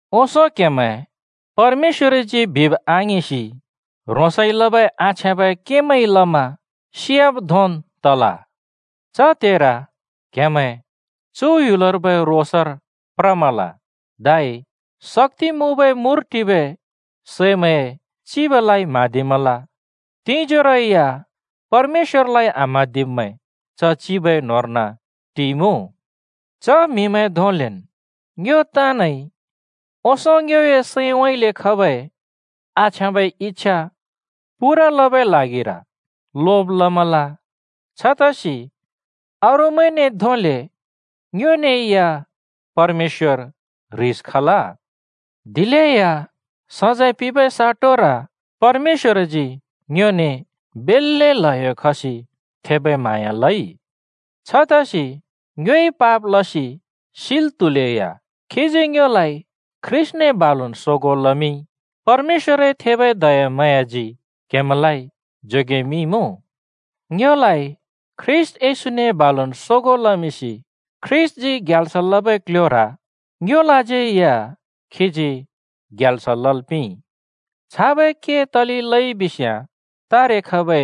ओंसों क्हेमैं परमेश्‍वरजी बिब् आङिंसि ह्रोंसइ लबै आछ्याँबै केमैंइ लमा सियाब् धोंन् तल। च त्हेर क्‍हेमैं चु ह्‍युलर्बै रोसर प्रमल, धै शक्‍ति मुँबै मुर टिबै सैमैंए चिबलाइ म्‍हाँदिमल। तिंजोरो या परमेश्‍वरलाइ आम्‍हाँदिब्‍मैं च चिबए न्होंर्न टिइमुँ। च म्हिमैं धोंलेन् ङ्यो ताँनइ ओंसों ङ्योए सैंउँइँले खबै आछ्याँबै इच्‍छा पूरा लबै ल्हागिर लोब लमल। छतसि अरूमैंने धोंले ङ्योने या परमेश्‍वर ह्रिस खल। दिलेया सजैं पिंबै साटोर परमेश्‍वरजी बेल्‍ले ल्हयो खसि थेबै म्हाँया लइ। छतसि ङ्योइ पाप लसि सिल् त्हुलेया खीजी ङ्योलाइ ख्रीष्‍टने बालुन् सोगों लमिंइ। परमेश्‍वरए थेबै दयाम्हाँयाजी क्‍हेमैंलाइ जोगेमिंइमुँ। ङ्योलाइ ख्रीष्‍ट येशूने बालुन् सोगों लमिंसि ख्रीष्‍टजी ग्याल्स लबै क्‍ल्‍ह्‍योर ङ्योलाज्यै या खीजी ग्याल्स लल् पिंइ। छाबै के तले लइ बिस्याँ तारे खबै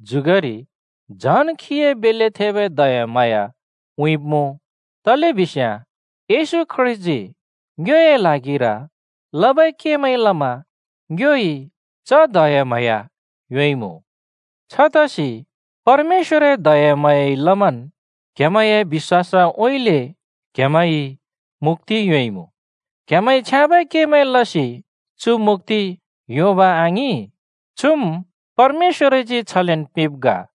जुगरि झन् खीए बेल्‍ले थेबै दयाम्हाँया उँइँब्‍मुँ। तलेबिस्‍याँ येशू ख्रीष्‍टजी ङ्योए ल्हागिर लबै केमैंइ लमा ङ्योइ च दयाम्हाँया योंइमुँ। छतसि परमेश्‍वरए दयाम्हाँयाइ लमन् क्‍हेमैंए बिश्‍वासउँइँले क्हेमैंइ मुक्‍ति योंइमुँ। क्हेमैंइ छ्याँबै केमैं लसि चु मुक्‍ति योंब आङिं, चुम् परमेश्‍वरजी छलेन् पिंब् ग।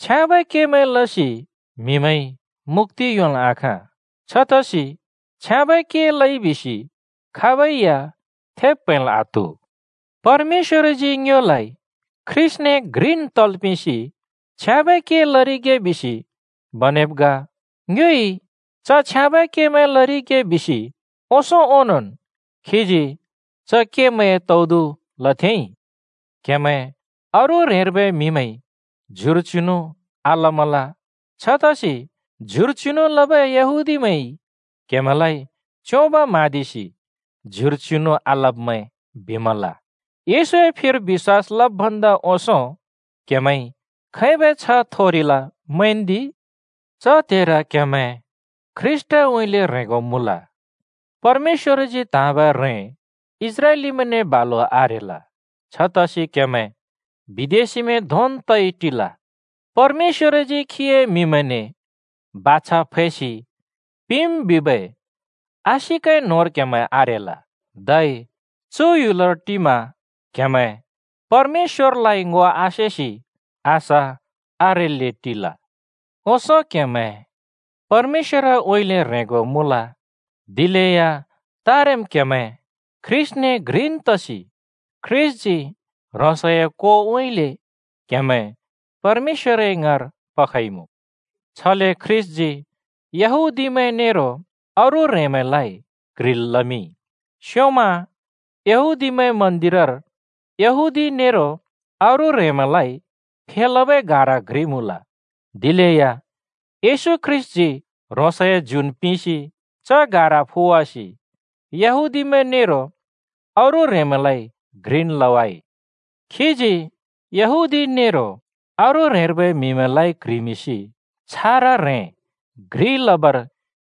छ्याँबै केमैं लसि म्हिमैंइ मुक्‍ति योंल् आखाँ। छतसि छ्याँबै के लइ बिसि खाबै या थेब् प्हैंल् आत्हु। परमेश्‍वरजी ङ्योलाइ ख्रीष्‍टने घ्रिन् तल् पिंसि छ्याँबै के लरिगे बिसि बनेब् ग। ङ्योइ च छ्याँबै केमैं लरिगे बिसि ओंसों ओंनोंन् खीजी च केमैंए तौदु लथेंइ। क्हेमैं अरू ह्रेंर्बै म्हिमैंइ ज्युर चिनु आलमल। छतसि ज्युर चिनु लबै यहूदीमैंइ क्‍हेमैंलाइ च्‍योंब म्‍हाँदिसि “ज्युर चिनु आलब्‍मैं” बिमल। येशूए फिर बिश्‍वास लब् भन्दा ओंसों क्हेमैंइ खैबै छ्ह थोरिल मैंन्दि। च त्हेर क्‍हेमैं ख्रीष्‍टउँइँले ह्रेंगो मुँल, परमेश्‍वरजी त्‍हाँबै ह्रें इस्राएलीमैंने बालु आरेल, छतसि क्‍हेमैं बिदेशिमैं धोंन् तइ टिल, परमेश्‍वरजी खीए म्‍हिमैंने बाछा फैसि पिंम् बिबै आशिकए न्होंर क्हेमैं आरेल, धै चु ह्‍युलर टिमा क्हेमैं परमेश्‍वरलाइ ङो आसेसि आशा आरेल्‍ले टिल। ओंसों क्‍हेमैं परमेश्‍वरउँइँले ह्रेंगो मुँल दिलेया तारेम् क्‍हेमैं ख्रीष्‍टने घ्रिन् तसि ख्रीष्‍टजी ह्रोंसए कोउँइँले क्‍हेमैं परमेश्‍वरए ङाँर पखइमुँ। छले ख्रीष्‍टजी यहूदीमैं नेरो अरू ह्रेंमैंलाइ क्‍ह्रिल् लमिंइ। स्योंम यहूदीमैंए मन्‍दिरर यहूदी नेरो अरू ह्रेंमैंलाइ फेलबै गारा घ्रि मुँल। दिलेया येशू ख्रीष्‍टजी ह्रोंसए ज्युन् पिंसि च गारा फुवासि यहूदीमैं नेरो अरू ह्रेंमैंलाइ घ्रिन् लवाइ। खीजी यहूदी नेरो अरू ह्रेंर्बै म्हिमैंलाइ क्ह्रिमिंसि छारा ह्रें घ्रि लबर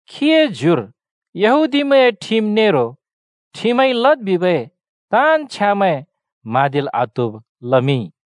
खीए ज्युर यहूदीमैंए ठिम नेरो ठिमइ लद् बिबै ताँन् छ्यामैं म्हाँदिल् आत्हुब लमिंइ।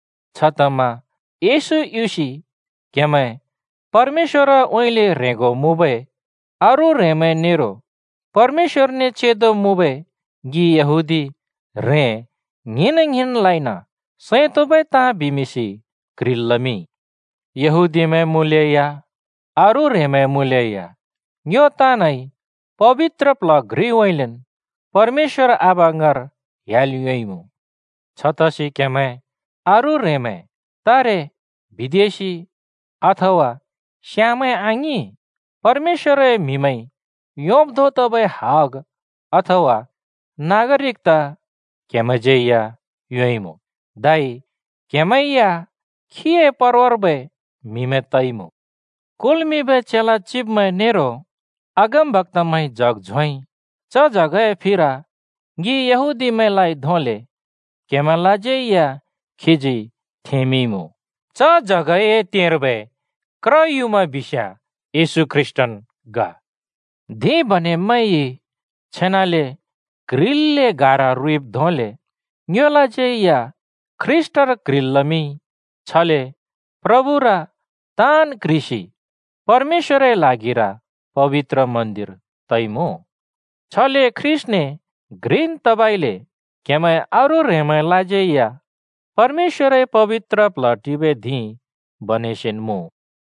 छतमा येशू युसि क्‍हेमैं परमेश्‍वरउँइँले ह्रेंगो मुँबै अरू ह्रेंमैं नेरो परमेश्‍वरने चेंदो मुँबै ङि यहूदी ह्रें ङ्हिंन-ङ्हिंनलाइन सैं तोंबै ताँ बिमिंसि क्ह्रिल् लमिंइ। यहूदीमैं मुँलेया अरू ह्रेंमैं मुँलेया ङ्यो ताँनइ पबित्र प्ल्ह घ्रिउँइँलेन् परमेश्‍वर आबा ङाँर ह्‍याल् योंइमुँ। छतसि क्‍हेमैं अरू ह्रेंमैं तारे बिदेशि अथवा स्‍याँमैं आङिं, परमेश्‍वरए म्‍हिमैंइ योंब् धों तबै हग अथवा नागरिकता क्हेमैंज्यै या योंइमुँ। धै क्‍हेमैं या खीए परवार्बै म्हिमैं तइमुँ। कुल्मिंबै चेला चिब्मैं नेरो अगमबक्‍तामैंइ जग झोंइ। च जगए फिर ङि यहूदीमैंलाइ धोंले क्‍हेमैंलाज्यै या खीजी थेंमिंइमुँ। च जगए तेंर्बै क्र युँमा बिस्याँ येशू ख्रीष्‍टन् ग। धिं बनेब्मैंइ छेनाले क्ह्रिल्‍ले गारा रुइब् धोंले ङ्योलाज्यै या ख्रीष्‍टर क्ह्रिल् लमिंइ। छले प्रभुर ताँन् क्ह्रिसि परमेश्‍वरए ल्हागिर पबित्र मन्‍दिर तइमुँ। छले ख्रीष्‍टने घ्रिन् तबइले क्हेमैं अरू ह्रेंमैंलाज्यै या परमेश्‍वरए पबित्र प्ल्ह टिबै धिं बनेसिन् मुँ।